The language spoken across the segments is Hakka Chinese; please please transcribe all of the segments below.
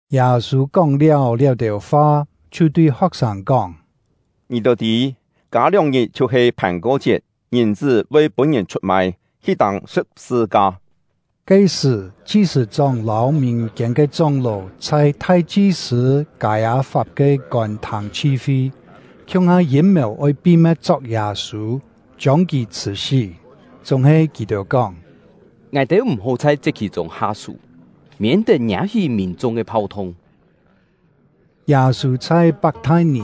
Yâ-sû kóng-liáu liá-têu fa, chhiu tui ho̍k-sâng kóng: “Ngì-têu tî, kâ lióng-ngit chhiu-he Phàn-ko-chiet, Ngìn-chṳ́ voi pûn-ngìn chhut-mai, hi tâng sṳ̍p-sṳ-ka.” Ke-sṳ̀, chi-sṳ̂-chóng lâu mìn-kiên ke chóng-ló chhai thai-chi-sṳ̂ Kâi-â-fap ke kôn-thâng chhi-fi, khiung-ha yîm-mèu oi pi-me̍t chok Yâ-sû, chiông kì chhṳ̀-sí. Chúng-he kì-têu kóng: “Ngài-têu m̀-hó chhai chiet-khì-chûng ha-sú, miên-tet ngiâ-hí mìn-chung ke phau-thung.” Yâ-sû chhai Pak-thai-nì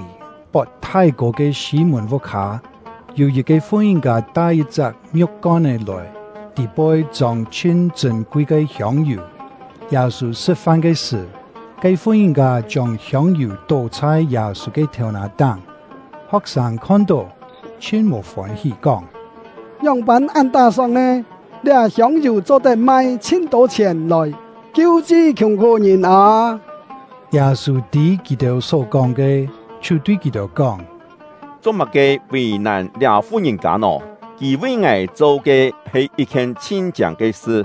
pot thái-kô ke Sî-mùn vuk-hâ; yû yit-ke fu-ngìn-kâ tai yit-chak ngiu̍k-kon-é lòi, tî-poi chông chhin chṳ̂n-kui ke hiông-yù. Yâ-sû sṳ̍t-fan ke sṳ̀, ke fu-ngìn-kâ chiông hiông-yù tó chhai Yâ-sû ke thèu-nà-táng. Ho̍k-sâng khon-tó, chhin mò fôn-hí, kóng: “Ngióng-pân án tá-sóng nè? Liá hiông-yù cho-tet mai chhin-tô chhièn lòi kiu-chi khiùng-khú-ngìn â!” Yâ-sû tî kì-têu só-kóng ke, chhiu tui kì-têu kóng: “Cho-má-ke vì-nàn liá fu-ngìn-kâ nò? Kì vi ngài cho ke he yit-khien chhin-chiâng ke sṳ.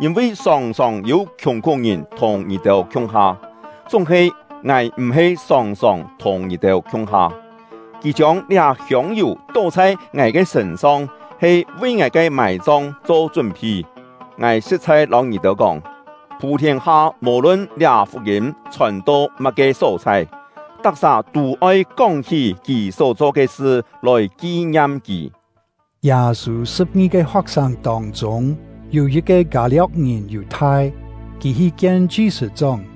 Yîn-vi sòng-sòng yû khiùng-khú-ngìn thùng ngì-têu khiung-ha, chúng-he ngài m̀-he sòng-sòng thùng ngì-têu khiung-ha. Kì chiông liá hiông-yù tó chhai ngài ke sṳ̂n-song he vi ngài ke mài-chong cho chún-phi. Ngài sṳ̍t-chhai lâu ngì-têu kóng, phû-thiên-ha, mò-lun liá fuk-yîm chhòn-to má-ke só-chhai, tak-sà tû oi kóng-hí kì só-cho ke sṳ, lòi ki-ngiam kì.” Yâ-sû sṳ̍p-ngi-ke ho̍k-sâng tông-chûng, yû yit-ke Kâ-lio̍k-ngìn Yù-thai; kì hi kien chi-sṳ̂-chóng,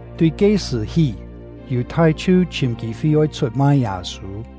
Tui ke-sṳ̀ hí, Yù-thai chhiu chhìm kî-fi oi chhut-mai Yâ-sû.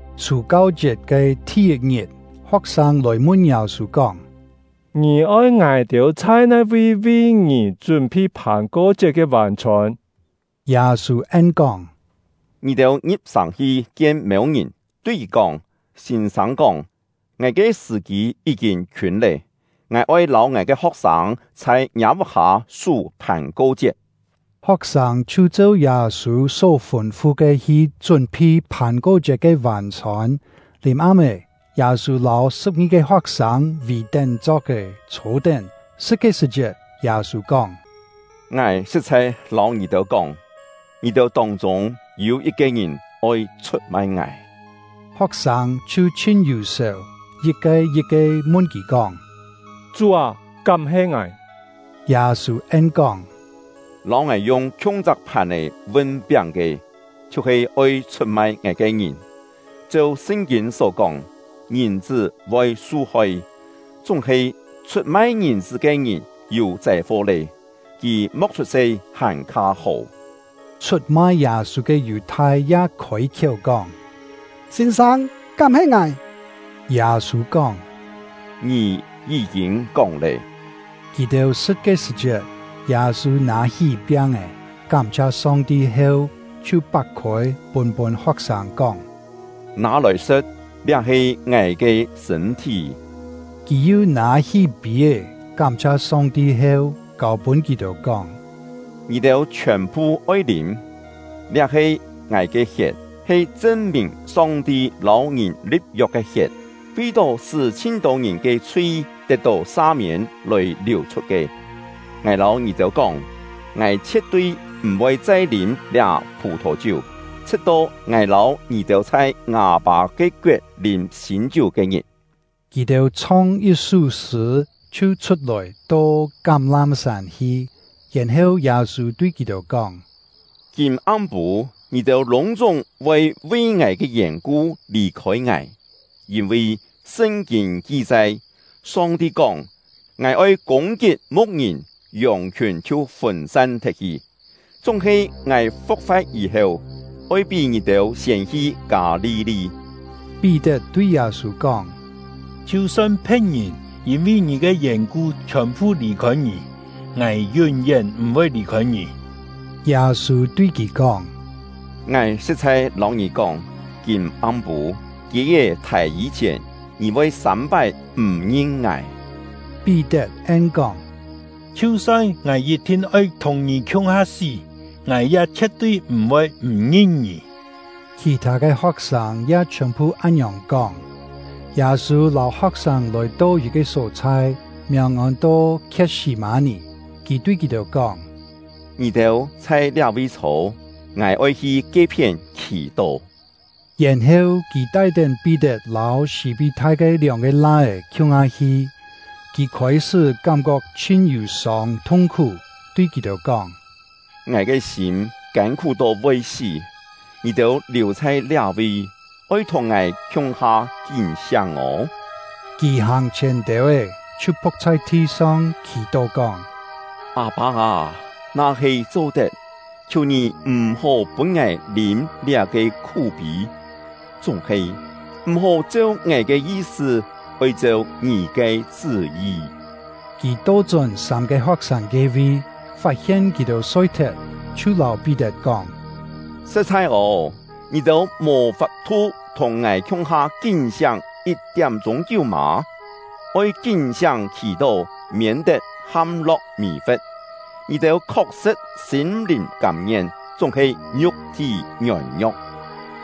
Chhù-kau-chiet ke thi-yit-ngit, ho̍k-sâng lòi mun Yâ-sû kóng: “Ngì oi ngài-têu chhai nai-vi vi ngì chún-phi Phàn-ko-chiet ke vân-chhôn?” Yâ-sû en-kóng: “Ngì-têu ngi̍p-sàng hi kien mêu-ngìn, tui kì kóng: ‘Sîn-sâng kóng: Ngài ke sṳ̀-kî yí-kîn khiûn lé; ngài oi lâu ngài ke ho̍k-sâng chhai ngiâ vuk-hâ sú Phàn-ko-chiet.’” Ho̍k-sâng chhiu cheu Yâ-sû só fûn-fu ke hi chún-phi Phàn-ko-chiet ke vân-chhôn. Lìm-am-é, Yâ-sû lâu sṳ̍p-ngi-ke ho̍k-sâng vì-tén chok-è chhô-tén. Sṳ̍t ke sṳ̀-chiet, Yâ-sû kóng: “Ngài sṳ̍t-chhai lâu ngì-têu kóng, ngì-têu tông-chûng yû yit-ke ngìn oi chhut-mai ngài.” Ho̍k-sâng chhiu chhin yù-sèu, yit-ke yit-ke mun kì kóng: “Chú â, kám he ngài?” Yâ-sû en-kóng: “Lâu ngài yung khiung-chak phàn-è vun-piáng ke, chhiu-he oi chhut-mai ngài ke ngìn. Cheu Sṳn-kîn só kóng, Ngìn-chṳ́ voi su-hoi; chúng-he chhut-mai Ngìn-chṳ́ ke ngìn yû châi-fo lé! Kì mo̍k chhut-se hàn-kha hó!” Chhut-mai Yâ-sû ke Yù-thai ya khôi-khiéu kóng: “Sîn-sâng, kám he ngài?” Yâ-sû kóng: “Ngì yí-kîn kóng lé!” Kì-têu sṳ̍t ke sṳ̀-chiet, Yâ-sû nâ-hí piáng-è, kám-chhia Song-ti heu, chhiu pak-khôi, pûn-pûn ho̍k-sâng, kóng: “Nâ-lòi sṳ̍t; liá he ngài ke sṳ̂n-thí.” Kì yu nâ-hí pî-é, kám-chhia Song-ti heu, kâu-pûn kì-têu, kóng: “Ngì-têu chhiòn-phu oi lîm; liá he ngài ke hiet, he chṳn-mìn Song-ti lâu ngìn li̍p-yok ke hiet, vi-tó sṳ́ chhin-tô ngìn ke chhui tet-tó sa-miên lòi liù-chhut ke. Ngài lâu ngì-têu kóng, ngài chhie̍t-tui m̀-voi chai lîm liá phù-thò-chiú, chhṳ̍t-to ngài lâu ngì-têu chhai ngâ Pâ ke koet lîm sîn-chiú ke-ngit.” Kì-têu chhong yit-sú sṳ̂, chhiu chhut-lòi, to Kám-lám-sân hi. Yèn-heu, Yâ-sû tui kì-têu kóng: “Kîm-am-pû, ngì-têu lûng-chúng voi vi ngài ke yèn-ku lì-khôi ngài; yîn-vi Sṳn-kîn ki-chai: Song-ti kóng: ‘Ngài oi kûng-kit mu̍k-ngìn, yòng-khiùn chhiu fûn-san thet-hi.’ Chúng-he ngài fu̍k-fa̍t yî-heu, oi pí ngì-têu siên hi Kâ-li-li.” Pí-tet tui Yâ-sû kóng: “Chhiu-son phe̍t-ngìn yîn-vi ngì ke yèn-ku chhiòn-phu lì-khôi ngì, ngài yún-yén m̀-voi lì-khôi ngì!” Yâ-sû tui kì kóng: “Ngài sṳ̍t-chhai lâu ngì kóng, kîm-am-pû, kiê-é thài yî-chhièn, ngì voi sâm-pái m̀ ngin ngài.” Pí-tet en-kóng: “Chhiu-son ngài yit-thin oi thùng ngì khiung-ha sí, ngài ya chhie̍t-tui m̀-voi m̀ ngin ngì!” Khì-thâ ke ho̍k-sâng ya chhiòn-phu án-ngiòng kóng. Yâ-sû lâu ho̍k-sâng lòi-to yit-ke só-chhai, miàng ôn-to Khiet-sî-mâ-nì; kì tui kì-têu kóng: “Ngì-têu chhai liá-vi chhô, ngài oi hi ke-phién khì-tó.” Yèn-heu kì tai-tén Pí-tet lâu Sî-pí-thai ke lióng-ke lai-é khiung-ha hi. Kì khôi-sṳ́ kám-kok chhin yù-sông thung-khú, tui kì-têu kóng: “Ngài ke sîm kân-khú to voi sí. Ngì-têu liù chhai liá-vi, oi thùng ngài khiung-ha kín-siáng ô!” Kì hàng-chhièn têu-é, chhiu phu̍k chhai thi-song, khì-tó kóng: “Â-pâ â, na-he cho-tet, khiù Ngì m̀-hó pûn ngài lîm liá-ke khú-pî! Chúng-he, m̀-hó cheu ngài ke yi-sṳ, oi cheu Ngì ke chṳ́-yi.” Kì to-chón sâm-ke ho̍k-sâng ke-vi, fat-hien kì-têu soi-thet, chhiu lâu Pí-tet kóng: “Sṳ̍t-chhai ô, ngì-têu mò fap-thu thùng ngài khiung-ha kín-siáng yit-tiám-chûng kiú mâ? Oi kín-siáng khì-tó, miên-tet ham-lo̍k mì-fe̍t. Ngì-têu khok-sṳ̍t sîm-lìn kâm-ngien, chúng-he ngiuk-thí ngiôn-ngio̍k.”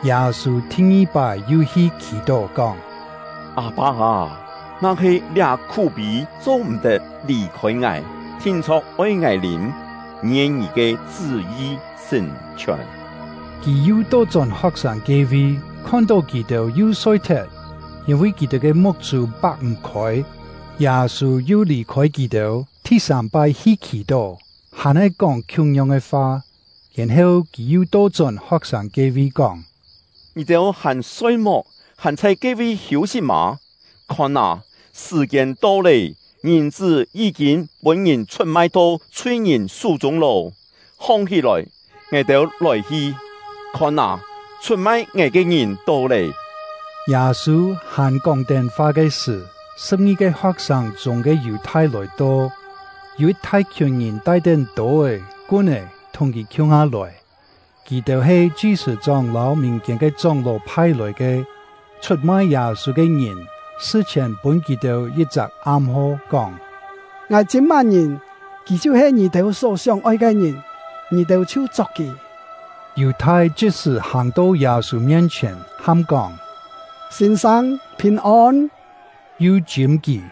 Yâ-sû thi-ngi-pái yu hi khì-tó, kóng: “Â-pâ â, na-he liá khú-pî cho-m̀-tet lì-khôi ngài, thin-chho̍k oi ngài lîm, ngien Ngì ke chṳ́-yi sṳ̀n-chhiòn!” Kì yu to-chón ho̍k-sâng ke-vi, khon-tó kì-têu yu soi-thet, yîn-vi kì-têu ke muk-chû pak-m̀-khôi. Yâ-sû yu lì-khôi kì-têu, thi-sâm-pái hi khì-tó, hàn-he kóng khiung-yong ke fa. Yèn-heu kì yu to-chón ho̍k-sâng ke-vi, kóng: “Ngì-têu hàn soi-muk, hàn chhai ke-vi hiû-sit mâ? Khon â, sṳ̀-kiên to lé, Ngìn-chṳ́ yí-kîn pûn-ngìn chhut-mai to chhui-ngìn sú-chûng lô. Hong-hí-lòi, ngài-têu lòi-hi! Khon â, chhut-mai ngài ke ngìn to lé!” Yâ-sû hàn kóng-tén fa ke sṳ̀, sṳ̍p-ngi-ke ho̍k-sâng chûng ke Yù-thai lòi-to. Yû yit thai-khiùn ngìn tai-tén tô-é, kun-é thùng kì khiung-ha lòi; kì-têu he chi-sṳ̂-chóng lâu mìn-kiên ke chóng-ló phai-lòi ke. Chhut-mai Yâ-sû ke ngìn sṳ-chhièn pûn kì-têu yit-chak am-ho, kóng: “Ngài chîm má-ngìn, kì chhiu-he ngì-têu só sióng-oi ke ngìn; ngì-têu chhiu chok kì.” Yù-thai chit-sṳ̀ hàng-to Yâ-sû mien-chhièn, ham kóng: “Sîn-sâng, phìn-ôn!” yu chîm kì.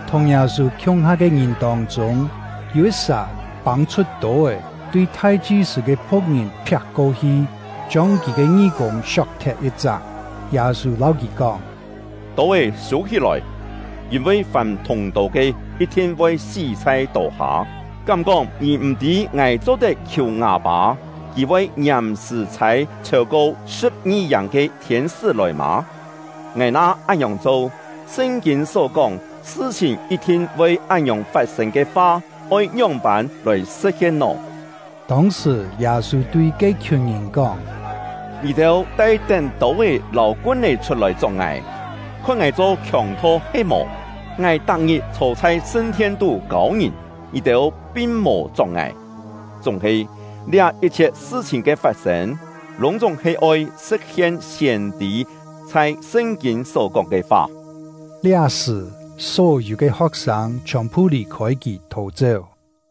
Thùng Yâ-sû khiung-ha ke ngìn tông-chûng, yû yit-sà pâng-chhut tô-é, tui thai-chi-sṳ̂ ke phu̍k-ngìn phiak-ko-hi, chiông kì ke ngí-kûng siok-thet yit-chak. Yâ-sû lâu kì kóng: “Tô-é sû-hí-lòi; yîn-vi fàm thûng-tô ke, yit-thin voi sí chhai tô-ha. Kám-kóng ngì m̀-tî ngài cho-tet khiù ngâ Pâ, Kì voi ngiàm-sṳ̀ chhâi chhêu-ko sṳ̍p-ngi-yàng ke thiên-sṳ́ lòi mâ? Ngài na án-ngiòng cho, Sṳn-kîn só kóng, sṳ-chhìn yit-thin voi án-ngiòng fat-sên ke fa oi ngióng-pân lòi sṳ̍t-hien nò?” Tông-sṳ̀, Yâ-sû tui ke-khiùn ngìn kóng: “Ngì-têu tai-tén tô-é lâu kun-é chhut-lòi chok ngài, khon ngài cho khiòng-tho he-mò? Ngài tak-ngit chhô chhai sṳn-thien-tú kâu ngìn, ngì-têu pin mò chok ngài. Chúng-he, liá yit-chhiet sṳ-chhìn ke fat-sên, lûng-chúng he oi sṳ̍t-hien siên-tî chhai Sṳn-kîn só-kóng ke fa.” Liá-sṳ̀, só-yû ke ho̍k-sâng chhiòn-phu lì-khôi kì thò-chéu.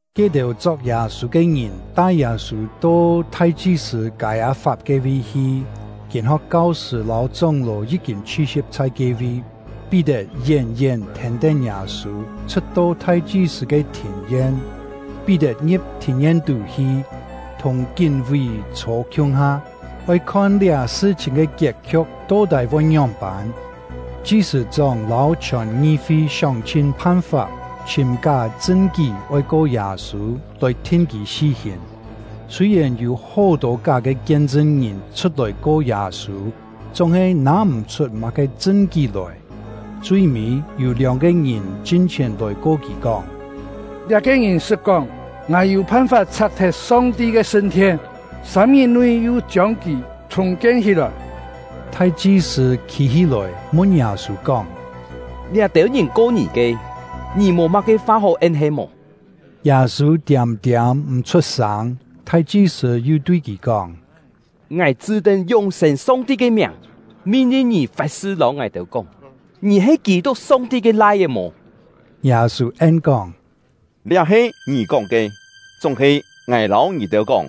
Ke-têu chok Yâ-sû ke ngìn tai Yâ-sû to thai-chi-sṳ̂ Kâi-â-fap ke-vi hi; kîn-ho̍k kau-sṳ̂ lâu chóng-ló yí-kîn chhi-si̍p chhai ke-vi. Pí-tet yén-yén thèn-tén Yâ-sû, chhṳ̍t-to thai-chi-sṳ̂ ke thìn-yen. Pí-tet ngi̍p thìn-yen-tú hi, thùng kín-ví chhô khiung-ha, oi khon liá sṳ-chhìn ke kiet-khiu̍k to-tái voi ngióng-pân. Chi-sṳ̂-chóng lâu chhiòn ngi-fi sióng-chhin phan-fap chhìm ká chṳn-kí oi ko Yâ-sû, lòi thin kì sí-hìn; sûi-yèn yû hó-tô ká ke kien-chṳn-ngìn chhut-lòi ko Yâ-sû, chúng-he nâ-m̀-chhut má-ke chṳn-kí lòi. Chui-mî, yû lióng-ke ngìn chin-chhièn lòi ko kì, kóng: “Liá-ke ngìn sṳt kóng: ‘Ngài yû phan-fap chhak-thet Song-ti ke sṳn-thien, sâm-ngit-nui yu chiông kì chhùng-kien hí-lòi.’” Thai-chi-sṳ̂ khî-hí-lòi, mun Yâ-sû kóng: “Liá-têu ngìn ko ngì ke, ngì mò má-ke fa hó en he-mò?” Yâ-sû tiâm-tiâm m̀ chhut-sâng. Thai-chi-sṳ̂ yu tui kì kóng: “Ngài chṳ́-tén yún-sên Song-ti ke miàng min-lin ngì fat-sṳ lâu ngài-têu kóng, ngì he Kî-tuk, Song-ti ke Lai-é mò?” Yâ-sû en-kóng: “Liá he ngì kóng ke. Chúng-he ngài lâu ngì-têu kóng,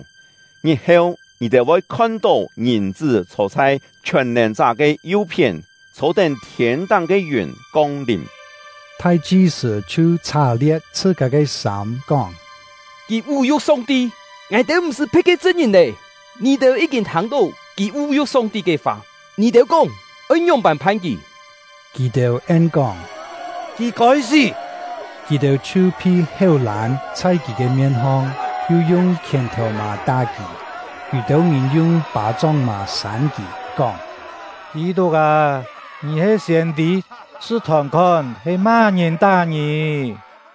ngit-heu, ngì-têu voi khon-tó Ngìn-chṳ́ chhô chhai Chhiòn-nèn-chá ke yu-phién, chhô-tén thiên-táng ke yùn kong-lìm!” Thai-chi-sṳ̂ chhiu chhá-lie̍t chhṳ-kâ ke sâm, kóng: “Kì vú-yu̍k Song-ti! Ngài-têu m̀-sṳ́ phe̍t ke chṳn-ngìn lé! Ngì-têu yí-kîn thâng-tó kì vú-yu̍k Song-ti ke fa; ngì-têu kóng oi ngióng-pân phan kì?” Kì-têu en-kóng: “Kì kôi sí!” Kì-têu chhiu phi héu-lân chhai kì ke mien-hong, yu yung khièn-thèu-mà tá kì. Yû-têu ngìn yung pâ-chóng-mà sân kì, kóng: “Kî-tuk â, ngì he siên-tî, chhṳ-thòn-khon, he má-ngìn tá ngì?”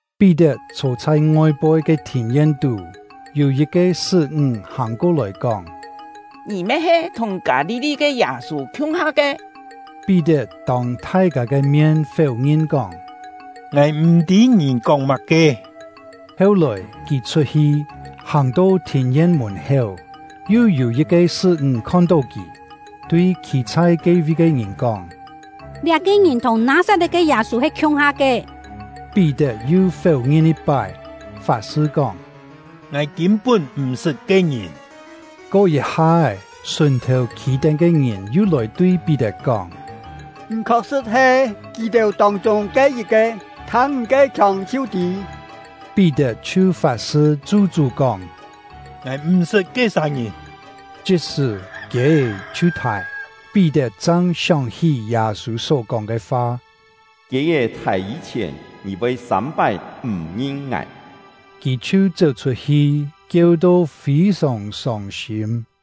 Pí-tet chhô chhai ngoi-poi ke thìn-yen-tú; yû yit-ke sṳ́-ńg hàng ko-lòi, kóng: “Ngì me he thùng Kâ-li-li ke Yâ-sû khiung-ha ke.” Pí-tet tông thai-kâ ke mien féu-ngin, kóng: “Ngài m̀-tî ngì kóng má-ke.” Heu-lòi, kì chhut-hi, hàng-to thìn-yen mùn-héu, yu yû yit-ke sṳ́-ńg khon-tó kì, tui khî chhai ke-vi ke ngìn kóng: “Liá-ke ngìn thùng Nâ-sat-le̍t ke Yâ-sû he khiung-ha ke.” Pí-tet yu féu-ngin yit-pái, fat-sṳ kóng: “Ngài kîn-pún m̀-sṳt ke-ngìn!” Ko yit-ha-é, sùn-thèu khî-tén ke ngìn yu lòi tui Pí-tet kóng: “Ngì khok-sṳ̍t he kì-têu tông-chûng ke yit-ke, thâng ngì ke khiông chhiu tî!” Pí-tet chhiu fat-sṳ chu-chú kóng: “Ngài m̀ sṳt ke-sà ngìn!” Chit-sṳ̀, kiê-é chhiu thài. Pí-tet chang sióng-hí Yâ-sû só-kóng ke fa: “Kiê-é thài yî-chhièn, ngì voi sâm-pái m̀ ngin ngài.” Kì chhiu chéu-chhut-hi, kieu-to fî-sòng sông-sîm.